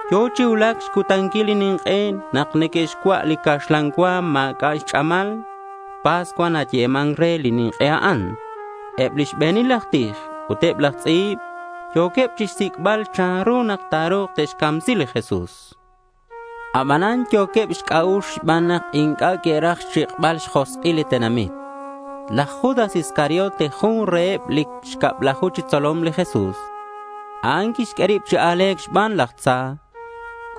Yo̱ chi cuulac xcutanquil li nink'e nak neque'xcua' li caxlan cua ma̱c'a' xch'amal. Pascua nayeman re li nink'e a'an. Eb lix be̱nil aj tij ut eb laj tz'i̱b yo̱queb chixsic'bal chanru nak ta̱ru̱k te'xcamsi li Jesús. Abanan yo̱queb xc'a'ux xban nak inc'a' que'raj xchik'bal xjosk'ileb li tenamit. Laj Judas Iscariote jun reheb lix cablaju chi xtzolom li Jesús. A'an quixq'ue rib chi a̱le̱c xban laj tza.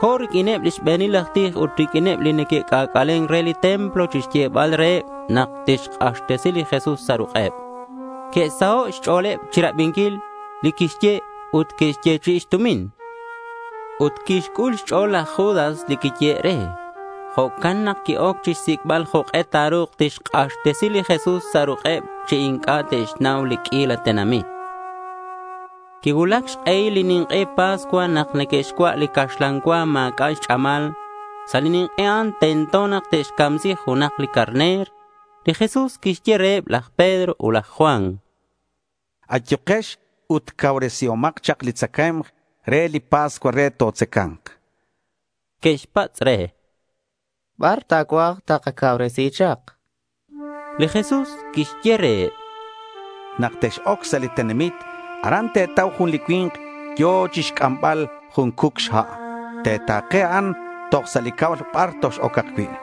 Co̱ riq'uineb li xbe̱nil aj tij ut riq'uineb li neque'c'ac'alen re li templo chixyebal reheb nak tixk'axtesi li Jesús sa' ruk'eb. Que'saho' xch'o̱leb chirabinquil li quixye ut que'xyechi'i xtumin. Ut quixc'ul xch'o̱l laj Judas li quiyehe' re. Jo'can nak qui-oc xsic'bal jok'e ta̱ru̱k tixk'axtesi li Jesús sa' ruk'eb chi inc'a' te'xnau li q'uila tenamit. Quicuulac xk'ehil li nink'e Pascua nak neque'xcua' li caxlan cua ma̱c'a' xch'amal. Sa' li nink'e a'an tento nak te'xcamsi junak li carner. Li Jesús quixye reheb laj Pedro ut laj Juan: —Ayukex ut cauresihomak chak li tzacae̱mk re li pascua re totzaca̱nk, chan. Que'xpatz' re: —¿Bar ta̱cuaj takacauresi chak?— Li Jesús quixye reheb: —Nak tex-oc sa' li tenamit, aran te̱tau jun li cui̱nk yo̱ chixc'ambal jun cuc xha'. Te̱ta̱ke a'an toj sa' li cab bar tox-ocak cui'.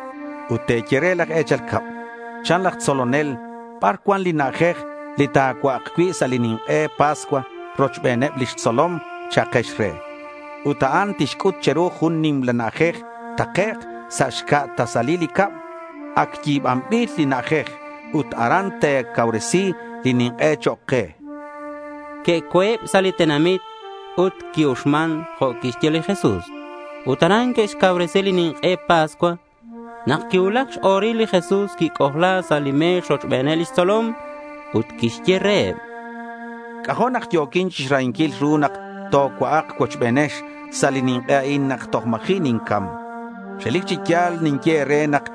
Ut te̱ye re laj e̱chal cab, “Chan laj tzolonel, ¿bar cuan li na'ajej li ta̱cua'ak cui' sa' li nink'e Pascua rochbeneb lix tzolom?” cha'akex re. Ut a'an tixc'ut che̱ru jun nimla na'ajej takec' sa' xca' tasalil li cab. Ac yi̱banbil li na'ajej. Ut aran te̱cauresi li nink'e chok' ke, chan li Jesús. Que'co̱eb sa' li tenamit ut qui-uxman jo' quixye li Jesús. Ut aran que'xcauresi li nink'e Pascua. Nak quicuulac x-o̱ril, li Jesús quic'ojla sa' li me̱x rochbeneb lix tzolom. Ut quixye reheb: —C'ajo' nak yo̱quin chixrahinquil ru nak tocua'ak cuochbenex sa' li nink'e a'in nak toj ma̱ji' nincam. Relic chi ya̱l ninye e̱re nak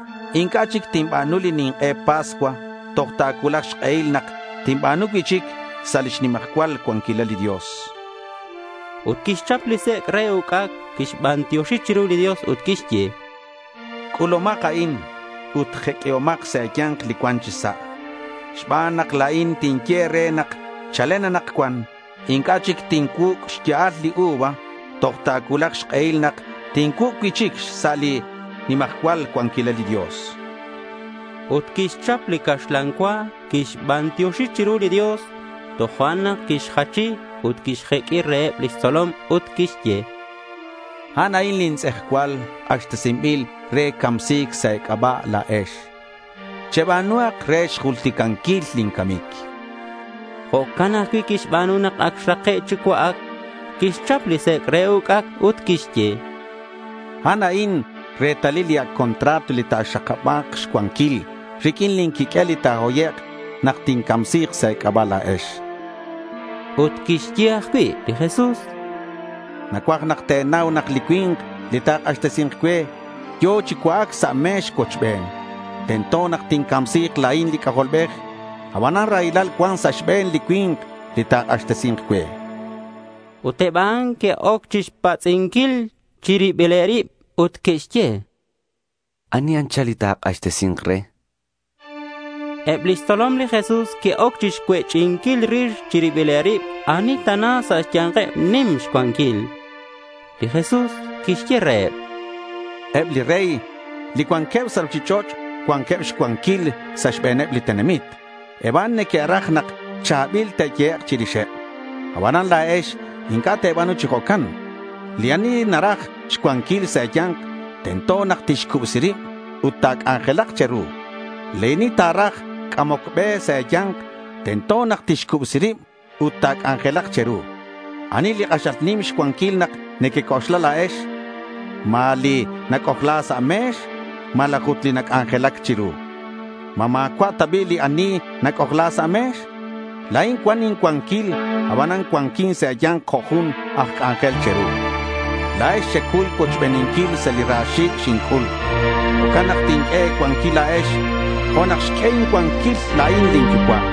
inc'a' chic tinba̱nu li nink'e Pascua toj ta̱cuulak xk'ehil nak tinba̱nu cui'chic sa' lix nimajcual cuanquilal li Dios, chan. Ut quixchap li sec' re uc'ac. Quixbantioxi chiru li Dios ut quixye: —C'ulumak a'in ut jeq'uihomak sa' e̱ya̱nk li cuan chi sa', xban nak la̱in tinye e̱re nak chalen anakcuan inc'a' chic tincuuc' xya'al li uva toj ta̱cuulak xk'ehil nak tincuuc' cui'chic sa' lix nimajcual cuanquilal li Dios, chan. Ut quixchap li caxlan cua, quixbantioxi chiru li Dios, tojo'nak quixjachi ut quixq'ue reheb lix tzolom ut quixye: —A'an a'in lin tz'ejcual, k'axtesinbil re camsi̱c sa' e̱c'aba' la̱ex. Cheba̱nuhak re xjulticanquil lin camic, chan. Jo'can ajcui' quixba̱nu nak ac xrake' chi cua'ac. Quixchap li sec' re uc'ac ut quixye: —A'an a'in retalil li ac' contrato li ta̱xakaba̱k xcuanquil riq'uin lin quiq'uel li ta̱hoyek' nak tincamsi̱k sa' e̱c'aba' la̱ex, chan. Ut quixye ajcui' li Jesús: —Nacuaj nak te̱nau nak li cui̱nk li ta̱k'axtesi̱nk cue yo̱ chi cua'ac sa' me̱x cuochben. Tento nak tincamsi̱k la̱in li C'ajolbej. Abanan raylal cuan sa' xbe̱n li cui̱nk li ta̱k'axtesi̱nk cue, chan li Jesús. Ut eb a'an que'oc chixpatz'inquil chi ribileb rib ut que'xye: —¿Ani anchal li ta̱k'axtesi̱nk re? chanqueb. Eb lix tzolom li Jesús que'oc chixcuech'inquil rix chi ribileb rib ani tana sa' xya̱nkeb nimak xcuanquil. Li Jesús quixye reheb: —Eb li rey li cuanqueb sa' ruchich'och' cuanqueb xcuanquil sa' xbe̱neb li tenamit. Eb a'an neque'raj nak cha̱bil ta̱yehek' chirixeb. Abanan la̱ex inc'a' te̱ba̱nu chi jo'can. Li ani naraj xcuanquil sa' e̱ya̱nk, tento nak tixcubsi rib ut ta̱c'anjelak che̱ru. Li ani ta̱raj c'amoc be sa' e̱ya̱nk, tento nak tixcubsi rib ut ta̱c'anjelak che̱ru. ¿Anili k'axal nim xcuanquil nak nequec'oxla la̱ex? ¿Ma li nac'ojla sa' me̱x, malaj ut li nac'anjelac chiru? ¿Ma ma̱cua' ta bi' li ani nac'ojla sa' me̱x? La̱in cuan incuanquil, aban cuanquin sa' e̱ya̱nk jo' jun aj c'anjel che̱ru. La̱ex xecuy cuochbeninquil sa' li ra xi̱c' xinc'ul. Jo'can nak tinq'ue e̱cuanquil la̱ex jo' nak xq'ue incuanquil la̱in lin Yucua'.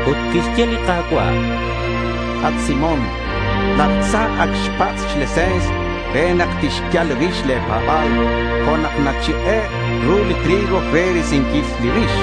Ut quixye li Ka̱cua': —At Simón, laj tza ac xpatz' xlese̱ns re nak tixyal rix le̱ pa̱ba̱l jo' nak nachik'e' ru li trigo re risinquil li rix.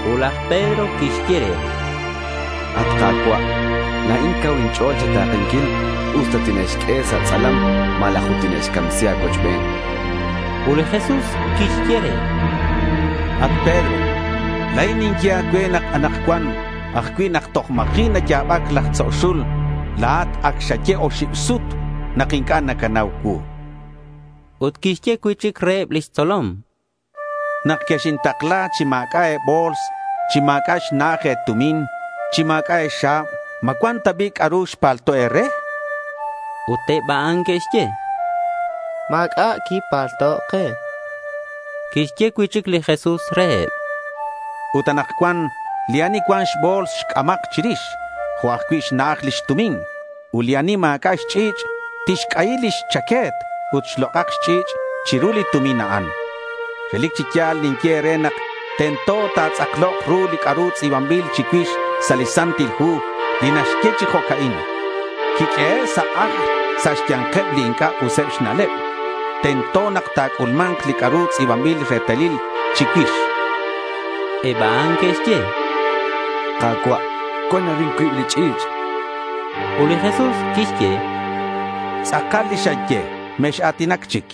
Ut laj Pedro quixye re: —At Ka̱cua', la̱in cau inch'o̱l cha̱ta̱kenquil usta tine'xq'ue sa' tz'alam malaj ut tine'xcamsi a̱cuochben, chan. Ut li Jesús quixye re: —At Pedro, la̱in ninye a̱cue, anakcuan ajcui' nak toj ma̱ji' naya̱bac laj tzo' xul, la̱at ac xaye oxib sut nak inc'a' nacanau cuu, chan. Ut quixye cui'chic reheb lix tzolom: —Nak quexintakla chi ma̱c'a' e̱bo̱ls, chi ma̱c'a' xna'aj e̱tumin, chi ma̱c'a' e̱xa̱b, ¿ma cuan ta bi' c'a'ru xpalto' e̱re? Ut eb a'an que'xye: —Ma̱c'a' quipalto' ke. Quixye cui'chic li Jesús reheb: —Ut anakcuan li ani cuan xbo̱ls, xc'amak chirix jo' ajcui' xna'aj lix tumin. Ut li ani ma̱c'a' xch'i̱ch', tixc'ayi lix chaque̱t ut xlok'ak xch'i̱ch' chiru li tumin a'an. Relic chi ya̱l ninye e̱re nak tento ta̱tz'aklok ru li c'a'ru tz'i̱banbil chicuix sa' li Santil Hu, li naxye chi jo'ca'in: Quiq'uehe' sa' ajl sa' xya̱nkeb li inc'a' useb xna'leb. Tento nak ta̱c'ulma̱nk li c'a'ru tz'i̱banbil retalil chicuix, chan. Eb a'an que'xye: —Ka̱cua', cuan arin cuib li ch'i̱ch', chanqueb. Ut li Jesús quixye: —Tz'akal li xeye. Mex-a̱tinac chic.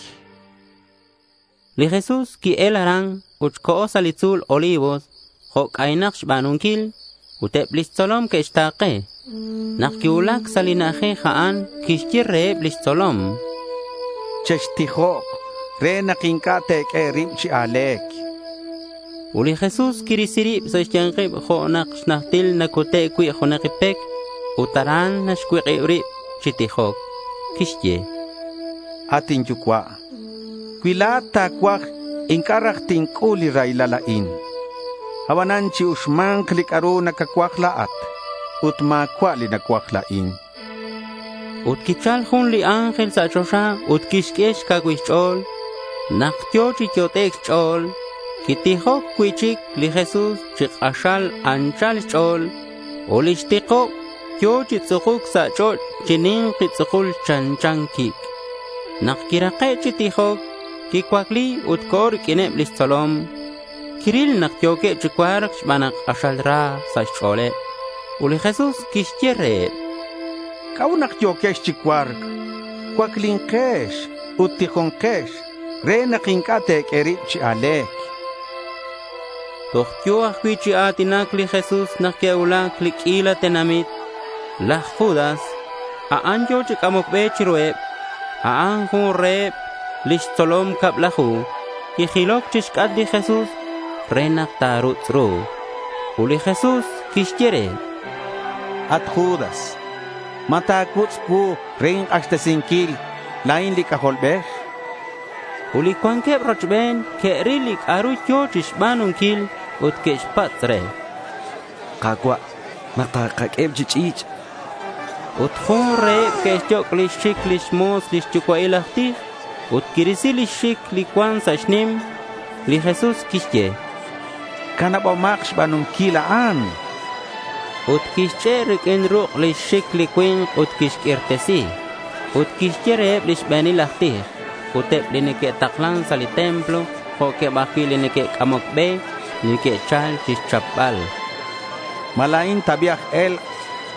Li Jesús qui-el aran ut co̱ sa' li tzu̱l Olivos, jo' c'aynak xba̱nunquil. Ut eb lix tzolom que'xta̱ke. Nak quicuulac sa' li na'ajej a'an, quixye reheb lix tzolom: —Chextijok re nak inc'a' te̱q'ue e̱rib chi a̱le̱c, chan. Ut li Jesús quirisi rib sa' xya̱nkeb jo' na xnajtil nacute' cui' junak pec. Ut aran quixcuik'ib rib chi tijoc. Quixye: —At inyucua', cui la̱at ta̱cuaj, inc'a' raj tinc'ul li raylal a'in. Abanan chi-uxma̱nk li c'a'ru nacacuaj la̱at ut ma̱cua' li nacuaj la̱in, chan. Ut quichal jun li ángel sa' choxa ut quixq'ue xcacuil xch'o̱l. Nak yo̱ chi yot'ec' xch'o̱l, quitijoc cui'chic li Jesús chi k'axal anchal xch'o̱l ut lix tikob yo̱ chi tz'ukuc sa' ch'och' chi ni̱nki tz'ukul chanchan quic'. Nak quirake' chi tijoc, quicuacli ut co̱ riq'uineb lix tzolom. Quiril nak yo̱queb chi cua̱rc xban nak k'axal ra sa' xch'o̱leb. Ut li Jesús quixye reheb: —¿C'a'ut nak yo̱quex chi cua̱rc? Cuaclinkex ut tijonkex re nak inc'a' te̱q'ue e̱rib chi a̱le̱c, chan reheb. Toj yo̱ ajcui' chi a̱tinac li Jesús nak que'cuulac li q'uila tenamit. Laj Judas, a'an yo̱ chi c'amoc be chiruheb. A'an jun reheb lix tzolom cablaju. Quijiloc chixc'atk li Jesús re nak ta̱rutz' ru. Ut li Jesús quixye re: —At Judas, ¿ma ta̱cuutz' cuu re ink'axtesinquil, la̱in li C'ajolbej? chan re. Ut li cuanqueb rochben que'ril li c'a'ru yo̱ chixba̱nunquil ut que'xpatz' re: —Ka̱cua', ¿ma takaq'ueheb chi ch'i̱ch'? chanqueb. Ut jun reheb quixyoc' lix xic lix mo̱s li xyucua'il aj tij ut quirisi lix xic li cuan sa' xnim. Li Jesús quixye: —Canabomak xba̱nunquil a'an, chan. Ut quixch'e' riq'uin ruk' lix xic li cui̱nk ut quixq'uirtesi. Ut quixye reheb li xbe̱nil aj tij, ut eb li neque'taklan sa' li templo, jo'queb ajcui' li neque'c'amoc be, li que'chal chixchapbal: —¿Ma la̱in ta bi' aj e̱lk'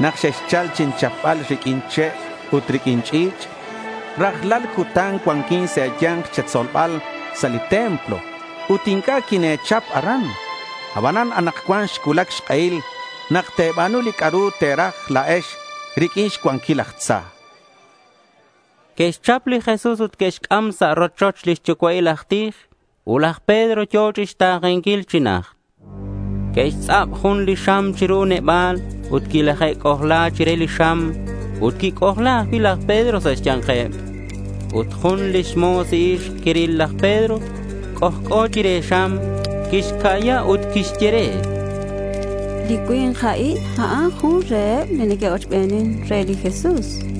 nak xexchal chinchapbal riq'uin che' ut riq'uin ch'i̱ch'? Rajlal cutan cuanquin sa' e̱ya̱nk che̱tzolbal sa' li templo ut inc'a' quine̱chap aran. Abanan anakcuan xcuulac xk'ehil nak te̱ba̱nu li c'a'ru te̱raj la̱ex riq'uin xcuanquil laj tza, chan li Jesús. Que'xchap li Jesús ut que'xc'am sa' rochoch li xyucua'il aj tij. Ut laj Pedro yo̱ chixta̱kenquil chi najt. Que'xtz'ab jun li xam chiru neba̱l, ut quilaje'c'ojla chire xam, ut quic'ojla ajcui' laj Pedro sa' xya̱nkeb. Ut jun li mo̱s ixk quiril laj Pedro c'ojc'o chire xam. Quixca'ya ut quixye: —Li cui̱nk a'in, a'an jun reheb li neque'ochbenin re li Jesús, chan.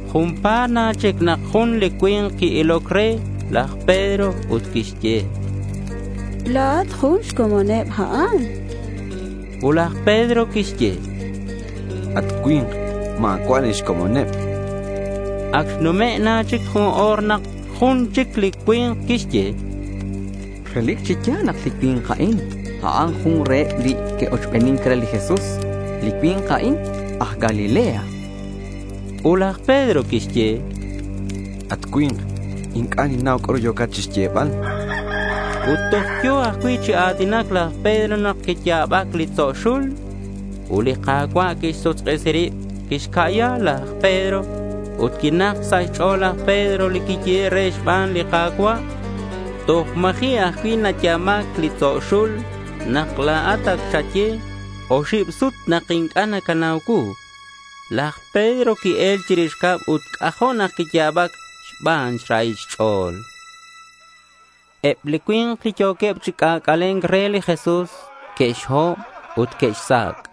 Junpa̱t na chic nak jun li cui̱nk qui-iloc re laj Pedro ut quixye: —La̱at jun xcomoneb a'an, chan re. Ut laj Pedro quixye: —At cui̱nk, ma̱cua' la̱in xcomoneb, chan. Ac xnume' na chic jun o̱r, nak jun chic li cui̱nk quixye: —Relic chi ya̱l nak li cui̱nk a'in, a'an jun reheb li que'ochbenin re li Jesús. Li cui̱nk a'in aj Galilea, chan. Ut laj Pedro quixye: —At cui̱nk, inc'a' ninnau c'a'ru yo̱cat chixyebal, chan. Ut toj yo̱ ajcui' chi a̱tinac laj Pedro nak quiya̱bac li tzo' xul. Ut li Ka̱cua' quixsuk'isi rib ut quixca'ya laj Pedro. Ut quinak sa' xch'o̱l laj Pedro li quiyehe' re xban li Ka̱cua', “Toj ma̱ji' ajcui' naya̱bac li tzo' xul, nak la̱at ac xaye oxib sut nak inc'a' nacanau cuu.” Laj Pedro qui-el chirix cab ut c'ajo' nak quiya̱bac xban xrahil xch'o̱l. Eb li cui̱nk li yo̱queb chi c'ac'ale̱nc re li Jesús, que'xhob ut que'xsac'.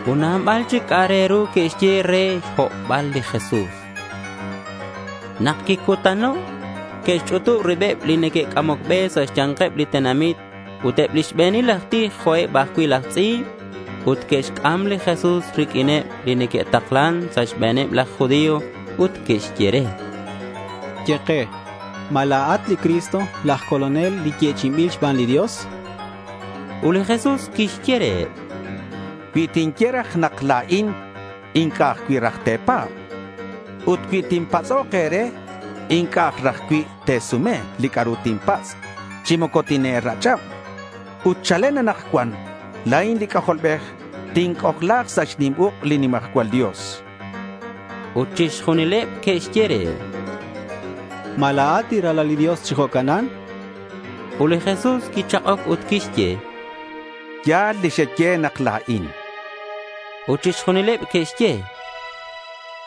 Ut nabal chic c'a'ak re ru que'xye re xhobbal li Jesús. Nak quicutano', que'xch'utub ribeb li neque'c'amoc be sa' xya̱nkeb li tenamit ut eb li xbe̱nil aj tij jo' eb ajcui' laj tz'i̱b. Ut que'xc'am li Jesús riq'uineb li neque'taklan sa' xbe̱neb laj judío. Ut que'xye re: —Ye ke. ¿Ma la̱at li Cristo, laj Colonel li yechi'inbil xban li Dios? chanqueb. Ut li Jesús quixye reheb: —Cui tinye e̱re nak la̱in, inc'a' ajcui' raj te̱pa̱b, chan. Ut cui tinpatz'ok e̱re, inc'a' aj raj cui' te̱sume li c'a'ru tinpatz', chi moco tine̱rach'ab. Ut chalen anakcuan la̱in li C'ajolbej tinc'ojla̱k sa' xnim uk' li nimajcual Dios, chan. Ut chixjunileb que'xye re: —¿Ma la̱at li Ralal li Dios chi jo'canan? Ut li Jesús quichak'oc ut quixye: —Ya̱l li xeye nak la̱in, chan. Ut chixjunileb que'xye: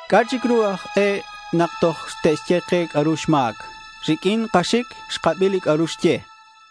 —¿C'a' chic ru aj e nak toj te'xye ke c'a'ru xma̱c? Riq'uin kaxic xkabi li c'a'ru xye, chanqueb.